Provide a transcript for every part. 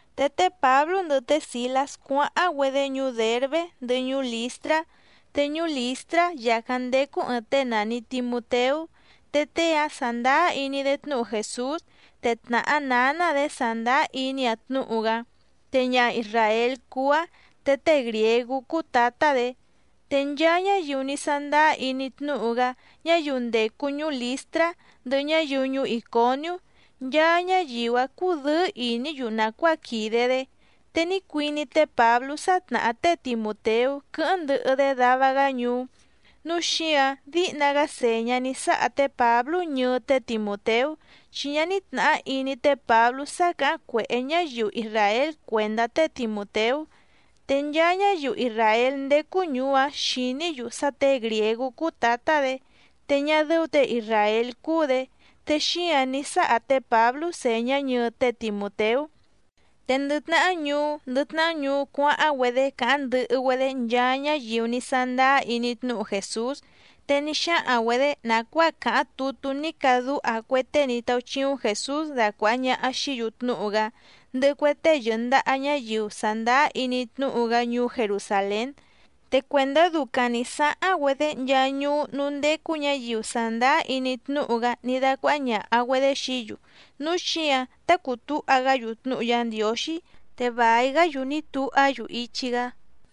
Te té Pǎblú ndɨhɨ té Sìlás cuáháⁿ‑güedé ñuú Dèrbé ndɨhɨ ñuú Lìstrá, te ñuú Lìstrá yàcáⁿ ndécú ɨ̀ɨⁿ tée nàni Timuteú. Te tée‑áⁿ sàndáá iní‑dé tnúhu Jèsús, te tnàhá nǎná‑dě sàndáá iní‑aⁿ tnúhu‑gá, te ñaha isràél cúú‑áⁿ, te tée grìégú cúú tǎtá‑dě. Te nchaa ñáyiu ní sándáá iní tnúhu‑gá ñáyiu ndècu ñuú Lìstrá, ndɨhɨ ñáyiu ñuú Ìconiú, nchaa ñáyiu‑áⁿ cúdɨ̌ɨ́ ìní‑yu nàcuáa quìde‑dé. Te ní cuiní té Pǎblú sá tnàhá té Timùteú quɨ́hɨ́ⁿ ndɨhɨ‑dé dava‑gá ñuú, núu xíǎⁿ díhna‑gá sèñá ní sáha té Pǎblú ñɨɨ té Timùteú, chi ñá ní tnàhá iní té Pǎblú sá càháⁿ cuèhé ñáyiu isràél cuèndá té Timùteú. Te nchaa ñáyiu isràél ndécú ñùú‑áⁿ xìní‑yu sá těe grìégú cúú tǎtá‑dě, te ñá dɨ́ú těe isràél cúú‑dě, te xíǎⁿ ní sáha té Pǎblú sèñá ñɨɨ té Timùteú. Te ndɨ tnahá ñuú ndɨ tnahá ñuú cuáháⁿ‑güedé càháⁿ ndɨhɨ‑güedé nchaa ñáyiu ní sándáá iní tnúhu Jèsús. Te ní xáhaⁿ‑güedě nàcuáa càháⁿ tutú ní cadúha cue tée ní táúchíúⁿ Jèsús dacuàha ñaha xií‑yu tnúhu‑gá, ndɨhɨ cue tée yɨ̀ndaha ñáyiu sàndáá iní tnúhu‑gá ñuú Jerusàlén. Te cuèndá ducaⁿ nǐ sáháⁿ‑güedé nchaa ñuú núú ndécú ñǎyiu sàndáá iní tnúhu‑gá ní dácuáhá ñàha‑güedé xií‑yu, núu xíǎⁿ tá cùu túha‑gá‑yu tnúhu Yá Ndiǒxí, te vài‑gá‑yu ní tuhá‑yu ichi‑gá.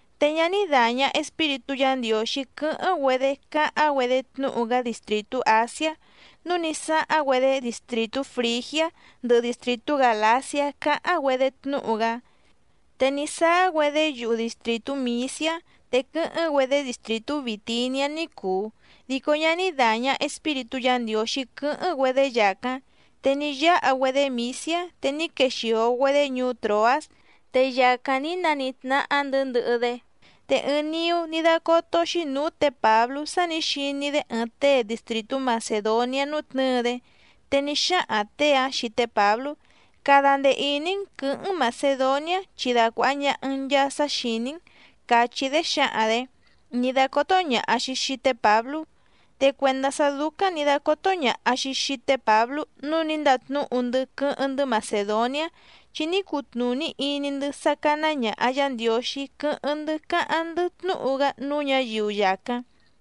Te ñá ní dàña Espíritú Yǎ Ndiǒxí quɨ́hɨ́ⁿ‑güedé cáháⁿ‑güedé tnúhu‑gá distrìtú Àsiá, núu ní sáháⁿ‑güedé distrìtú Frìgiá ndɨhɨ distrìtú Gàlaciá cáháⁿ‑güedé tnúhu‑gá. Te ní sáá‑güedé yuhu distrìtú Mìsiá. Te quɨ́hɨ́ⁿ‑güedé distrìtú Bìtiniá ní cùu, dico ñá ní dàña Espíritú Yǎ Ndiǒxí quɨ́hɨ́ⁿ‑güedé yàcáⁿ. Te ní yáha‑güedé Mìsiá, te ní quexìo‑güedé ñuú Tròás, te yàcáⁿ ní nanítnáhá‑ndɨ̌ ndɨhɨ‑dé. Te ɨɨⁿ niú ní dácótó‑xí nǔú tě Pǎblú sá nǐ xiní‑dé ɨɨⁿ tée distrìtú Macèdoniá nútnɨ̌ɨ‑dé, te ní xáhaⁿ těe‑áⁿ xii té Pǎblú: “Cada ndee ìní‑n quɨ̌hɨ́ⁿ‑n Màcedoniá chi dacuàha ñaha‑n nchaa sá xìní‑n”, càchí‑dé xǎhaⁿ‑dě, ní dácótó ñàha‑xi xii té Pǎblú. Te cuèndá sá dúcáⁿ nǐ dácótó ñàha‑xi xii té Pǎblú nǔu ní ndatnúhu‑ndɨ́ quɨ́hɨ́ⁿ‑ndɨ́ Macèdoniá, chi ní cutnùní iní‑ndɨ́ sá cáná ñàha Yá Ndiǒxí quɨ́hɨ́ⁿ‑ndɨ́ cáháⁿ‑ndɨ́ tnúhu‑gá núú ñǎyiu yàcáⁿ.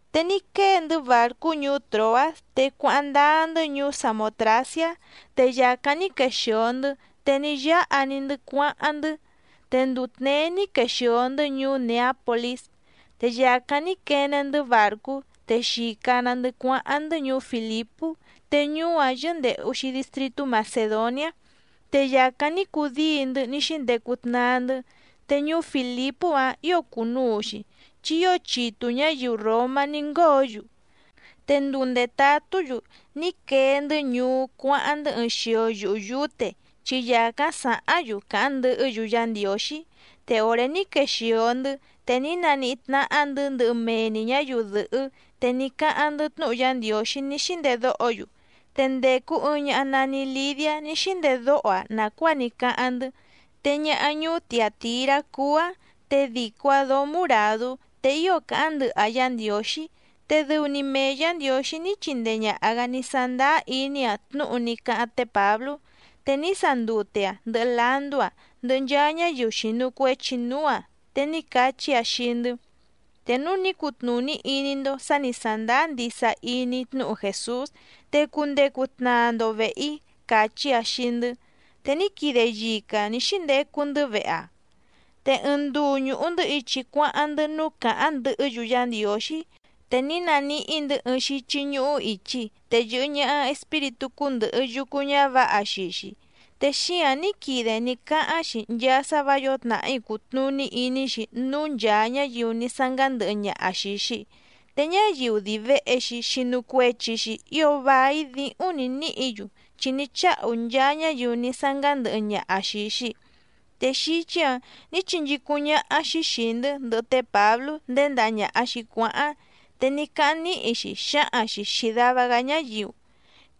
Te ní quée‑ndɨ́ bàrcú ñuú Tròás, te cuáháⁿ ndáá‑ndɨ́ ñuú Samòtraciá, te yàcáⁿ ní quexìo‑ndɨ́, te ní yáha‑ni‑ndɨ́ cuáháⁿ‑ndɨ́. Te nduu tněé ní quexìo‑ndɨ́ ñuú Nèápolís. Te yàcáⁿ ní quene‑ndɨ́ bàrcú, te xìca‑na‑ndɨ́ cuáháⁿ‑ndɨ́ ñuú Fìlipú te ñuú‑áⁿ yɨ́ndèhu‑xi distritú Macèdoniá. Te yàcáⁿ ní cudíi‑ndɨ́ ní xíndecu tnaa‑ndɨ́. Te ñuú Fìlipú‑áⁿ ǐo cùnuu‑xi, chi ío chitu ñǎyiu ròmá ní ngóo‑yu. Te nduu ndètatú‑yu ní quee‑ndɨ́ ñuú cuáháⁿ‑ndɨ́ ɨɨⁿ xio yuhu yǔte, chi yàcáⁿ sàháⁿ‑yu càháⁿ ndɨhɨ́‑yu Yá Ndiǒxí. Te òré ní quexìo‑ndɨ́, te ní naníhí tnáhá‑ndɨ̌ ndɨhɨ mee‑ni ñǎyiu dɨ̀hɨ́, te ní cáháⁿ‑ndɨ́ tnúhu Yá Ndiǒxí ní xíndedóho‑yu. Te ndècu ɨɨⁿ ñaha nani Lidiá ní xíndedóho‑aⁿ nàcuáa ní cáháⁿ‑ndɨ́, te ñaha ñuú Tiàtirá cúú‑áⁿ, te dìco‑aⁿ dóó muràdú, te ío càháⁿ ndɨhɨ‑aⁿ Yá Ndiǒxí. Te dɨu‑ni mee Yǎ Ndiǒxí ní chindee ñàha‑gá ní sándáá iní‑aⁿ tnúhu ní cáháⁿ té Pǎblú. Te ní sandute‑aⁿ ndɨhɨ landú‑aⁿ, ndɨhɨ nchaa ñáyiu xìnu cuechi núú‑aⁿ, te ní cachí‑aⁿ xii‑ndɨ́: —Te núu ní cutnùní iní‑ndó sǎ nǐ sándáá ndisa iní‑í tnúhu Jèsús, te cundecu tnaa‑ndo vèhe‑í —càchí‑aⁿ xii‑ndɨ́. Te ní quide yica‑aⁿ nǐ xíndecu‑ndɨ́ vehe‑aⁿ. Te ɨɨⁿ nduu ñùhu‑ndɨ́ ichi cuáháⁿ‑ndɨ́ núú càháⁿ ndɨhɨ́‑yu Yá Ndiǒxí, te ní naníhí‑ndɨ̌ ɨɨⁿ xíchí ñúhú ìchi, te yɨ̀hɨ ñaha espíritú cúndɨ̀hɨ yucu ñávǎha xii‑xi. Te xíǎⁿ ní quide ní cáháⁿ‑xi nchaa sá vǎ yǒo tnàhí cùtnuní iní‑xi núú nchàa ñáyiu ní sángándɨhɨ ñaha xìi‑xi. Te ñáyiu dii vèhe‑xi xinu cuechi‑xi ío vài díhúⁿ nǐ níhǐ‑yu chi ní cháhu nchaa ñáyiu ní sángándɨhɨ ñaha xìi‑xi. Te xíchí‑ǎⁿ nǐ chinchícúⁿ ñáhá‑xí xìi‑ndɨ́ ndɨhɨ té Pǎblú nděndaha ñàha‑xi cuáháⁿ, te ní cáháⁿ níhi‑xi xǎhaⁿ‑xi xìi dava‑gá ñáyiu: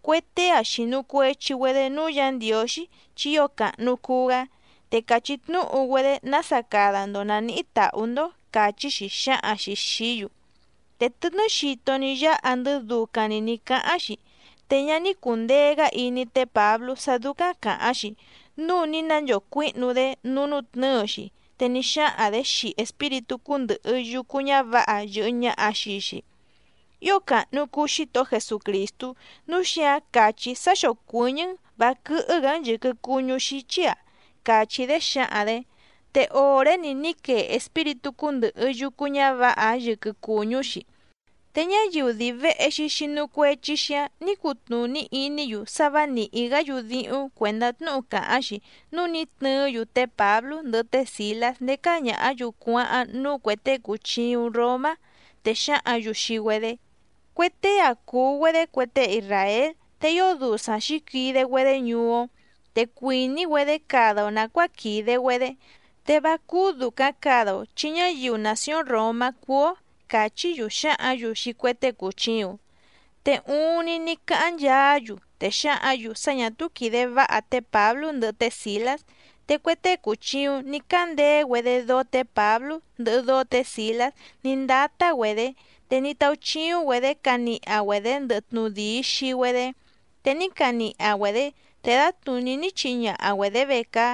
—Cue tée‑a xìnu cuechi‑güedé núú Yǎ Ndiǒxí, chi ío càhnu cuu‑gá, te càchí tnúhu‑güedé nása cada‑ndo nàníhí tàhú‑ndó —càchí‑xi xǎhaⁿ‑xi xìí‑yu. Te tɨtnɨ́ xito ní yáha‑ndɨ́ ducaⁿ‑ni nǐ cáháⁿ‑xi. Te ñá ní cùndee‑gá iní té Pǎblú sá dúcáⁿ càháⁿ‑xi, núu ní nanchocuíhnu‑dé núú nútnɨ̌ɨ‑xi, te ní xáhaⁿ‑dě xii espíritú cúndɨ̀hɨ yucu ñávǎha yɨ̀hɨ ñaha xii‑xi: —Ío càhnu cuu Xítohó Jesucrìstú, núu xíǎⁿ càchí‑í sá xócuɨ̀ñɨ́‑n vǎ quɨ́hɨ́‑gǎ‑n yɨ̀quɨ cuñú xíchí‑a —càchí‑dé xǎhaⁿ‑dě. Te òré‑ni ní quee espíritú cúndɨ̀hɨ yucu ñávǎha‑áⁿ yɨquɨ cùñú‑xi. Te ñáyiu dii vèhe‑xi xinu cuechi‑xi‑áⁿ nǐ cutnùní iní‑yu sá vǎ nìhí‑gá‑yu díhúⁿ cuèndá tnúhu càháⁿ‑xi, núu ní tnɨɨ́‑yu té Pǎblú ndɨhɨ té Sìlás ndécá ñàhá‑yu cuáháⁿ núú cuè tée cùchiuⁿ Romá, te xáhǎⁿ‑yu xii‑güedé: —Cue tée‑a cùu‑güedé cue tée isràél, te ío dusaⁿ xǐquide‑güedé ñuú‑ó. Te cuìní‑güedé cada‑o nàcuáa quìde‑güedé, te vá cúú dùcaⁿ cada‑o chi ñáyiu nàcióⁿ Ròmá cúú‑ó —càchí‑yu xǎhǎⁿ‑yu xii cue tée cùchiuⁿ. Te uuⁿni ní cáháⁿ nchaá‑yu, te xǎhǎⁿ‑yu sá ñà túú quìde váha té Pǎblú ndɨhɨ té Sìlás. Te cue tée cùchiuⁿ ní cándeé‑güedé dóó tě Pǎblú ndɨhɨ dóó tě Sìlás ní ndátá‑güedě, te ní táúchíúⁿ‑güedě caniha‑güedě ndɨhɨ tnudìi xii‑güedé. Te ní caniha‑güedě, te dǎtnùní ní chihi ñaha‑güedě vecaá.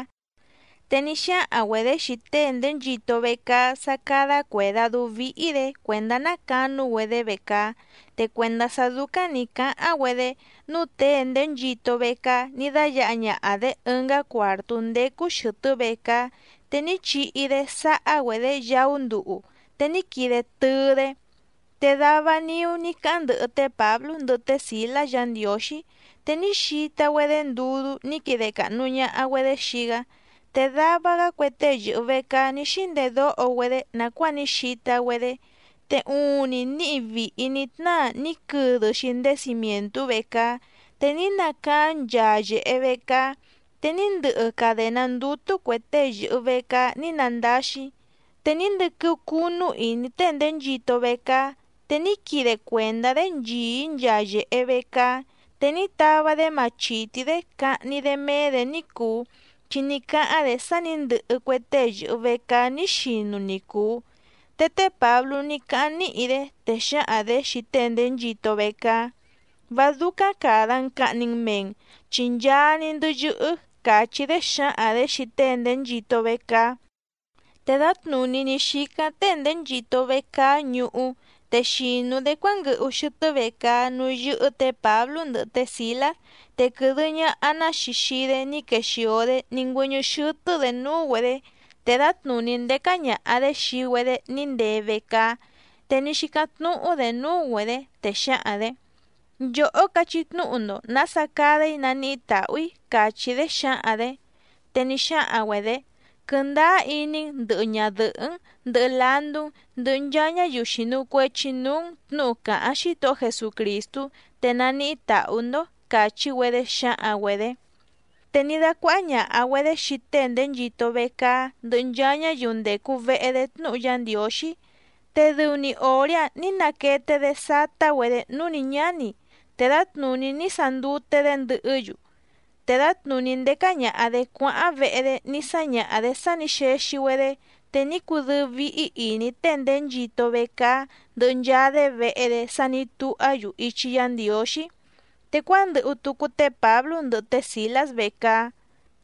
Te ní xáhaⁿ‑güedě xii tée nděnchito vecaá sá cádá cuèdadú víhí‑dě cuèndá ná canú‑güedé vecaá. Te cuèndá sá dúcáⁿ nǐ cáháⁿ‑güedé, núu tée nděnchito vecaá ní dáyǎha ñaha‑dě ɨngá cuàrtú ndécú xɨ̀tɨ́ vecaá, te ní chihi‑dé sáhá‑güedě yaú nduhu, te ní quide tɨɨ‑dé. Te dava niú ní cáháⁿ ndɨhɨ té Pǎblú ndɨhɨ té Sìlás Yǎ Ndiǒxí, te ní xita‑güedé ndudú ní quide càhnu ñaha‑güedé xii‑gá. Te dava‑gá cue tée yɨ̀hɨ vecaá ní xíndedóho‑güedé nàcuáa ní xita‑güedé. Te uuⁿni níhi vìhi ní tnáa ní quɨdɨ‑xi ndéé cimièntú vecaá, te ní nacaáⁿ nchaa yèhe vecaá, te ní ndɨhɨ cadèná ndútú cuè tée yɨ̀hɨ vecaá ní nandáxí. Te ní ndɨquɨ́ú cúnú ìní tée nděnchito vecaá, te ní quide cuèndá‑dé nchìí nchaa yèhe vecaá. Te ní tava‑dé machìtí‑dé cahni‑dé méé‑dě ní cùu, chi ní cáháⁿ‑dě sá nǐ ndɨhɨ cue tée yɨ̀hɨ vecaá ní xinu ni cùu. Te té Pǎblú ní cáháⁿ níhi‑dé, te xǎhaⁿ‑dě xii tée nděnchito vecaá: —Vá dúcáⁿ càda‑n cahni‑n mee‑n, chi nchaa‑ni‑ndɨ́ yɨ́hɨ́ —càchí‑dé xǎhaⁿ‑dě xii tée nděnchito vecaá. Te dǎtnùní ní xícáⁿ tée nděnchito vecaá ñuhú, te xìnu‑dé cuánguɨhu xɨtɨ́ vecaá núú yɨ́hɨ́ tě Pǎblú ndɨhɨ té Sìlás, te quɨ̀dɨ ñaha‑ná‑xi xii‑dé ní quexìo‑dé ní ngüɨ́ñɨ́ xɨ́tɨ́‑dě núú‑güedě. Te dǎtnùní ndécá ñàha‑dé xii‑güedé ní ndee vecaá, te ní xícáⁿ tnúhú‑dě núú‑güedě, te xǎhaⁿ‑dě: —Nchòhó cachí tnúhu‑ndo nǎsa cada‑í naníhí tàhú‑í —càchí‑dé xǎhaⁿ‑dě. Te ní xáhaⁿ‑güedě: —Quɨndáá iní‑n ndɨ̀hɨ ñadɨhɨ́‑n, ndɨhɨ landú‑n, ndɨhɨ nchaa ñáyiu xìnu cuechi núú‑n tnǔhu càháⁿ Xítohó Jesucrìstú, te naníhí tàhú‑ndó —càchí‑güedé xǎhaⁿ‑güedě. Te ní dácuáhá ñàha‑güedé xii tée nděnchito vecaá ndɨhɨ nchaa ñáyiu ndècu vehe‑dé tnúhu Yá Ndiǒxí. Te dɨu‑ni òré‑áⁿ nǐ naquete‑dé sátá‑güedě núú nǐ ñáni, te dǎtnùní ní sandute‑dé ndɨhɨ́‑yu. Te ndèca ñaha‑dé cuáháⁿ vehe‑dé ní sáñaha‑dě sá nǐ xexi‑güedé, te ní cudɨ́ɨ́ víhí ìní tée nděnchito vecaá ndɨhɨ nchaa‑dé vehe‑dé sá nǐ tuhá‑yu ichi Yá Ndiǒxí. Te cuándɨhu tucu té Pǎblú ndɨhɨ té Sìlás vecaá.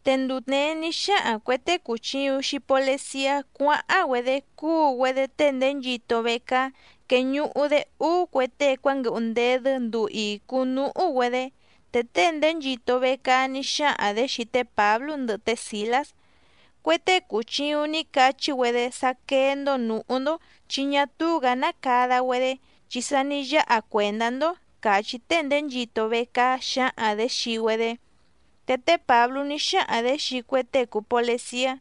Te nduu tněé ní xáhaⁿ cuè tée cùchiuⁿ xii poleciá cuáháⁿ‑güedé cúu‑güedé tée nděnchito vecaá queñuhu‑dé úú cue tée cuánguɨhu ndedɨ́ nduu ìcu núhú‑güedé. Te tée nděnchito vecaá ní xáhaⁿ‑dě xii té Pǎblú ndɨhɨ té Sìlás: —Cue tée cùchiuⁿ ní cachí‑güedé sá quéé‑ndó nǔhú‑ndó, chi ñá túú‑gǎ ná cada‑güedé, chi sa ní yáha cuèndá‑ndó —càchí tée nděnchito vecaá xǎhaⁿ‑dě xii‑güedé. Te té Pǎblú ní xáhaⁿ‑dě xii cue tée cùu poleciá: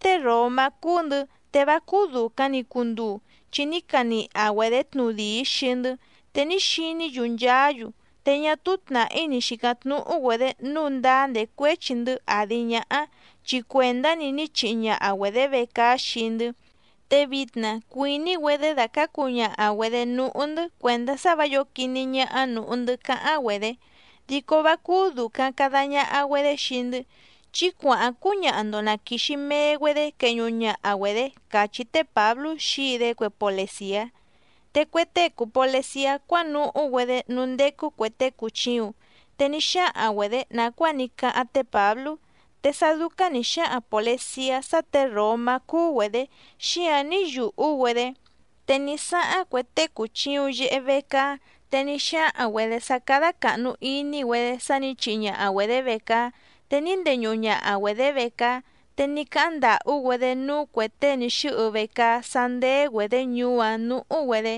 —Tée ròmá cúú‑ndɨ̌, te vá cúú dùcaⁿ‑ni cunduu, chi ní caniha‑güedě tnudìi xii‑ndɨ́, te ní xiní‑yu nchaá‑yu. Te ñá túú tnàhí ni xìcáⁿ tnúhú‑güedě nǔu ndáá ndècuéchi‑ndɨ́ àdi ñáhá, chi cuèndá‑ni ní chihi ñaha‑güedě vecaá xii‑ndɨ́. Te vitna cuìní‑güedé dacǎcu ñaha‑güedě núhú‑ndɨ́ cuèndá sá vǎ yǒo quiní ñáhá nǔhú‑ndɨ́ cáháⁿ‑güedě, dico vá cúú dùcaⁿ cada ñaha‑güedé xii‑ndɨ́. Chí cuàháⁿ cúñaha‑ndo na quìxi mee‑güedé queñuhu ñaha‑güedě —càchí té Pǎblú xǐi‑dé cue polecìá. Te cue tée cùu poleciá cuánuhú‑güedé núú ndécú cuè tée cùchiuⁿ, te ní xáhaⁿ‑güedě nàcuáa ní cáháⁿ té Pǎblú. Te sá dúcáⁿ nǐ xáhaⁿ pòleciá sá těe ròmá cúú‑güedě, xíǎⁿ ní yùhú‑güedé. Te ní sáháⁿ cue tée cùchiuⁿ yehe vecaá, te ní xáhaⁿ‑güedě sá cádá càhnu iní‑güedé sá nǐ chihi ñaha‑güedě vecaá, te ní ndeñuhu ñaha‑güedě vecaá. Te ní cáháⁿ ndàhú‑güedé núú cuè tée ní xɨ́hɨ vecaá sá ndéé‑güedě ñuú‑áⁿ nǔhú‑güedé.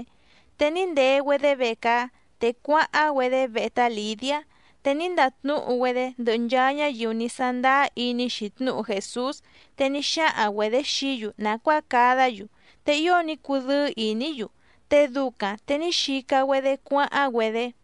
Te ní ndee‑güedé vecaá, te cuáháⁿ‑güedé vehe tá Lìdiá, te ní ndatnúhu‑güedé ndɨhɨ nchaa ñáyiu ní sándáá iní‑xi tnúhu Jèsús, te ní xáhaⁿ‑güedě xií‑yu nàcuáa cadá‑yu, te ío ní cudɨ́ɨ́ ìní‑yu, te ducaⁿ te ní xica‑güedé cuáháⁿ‑güedé.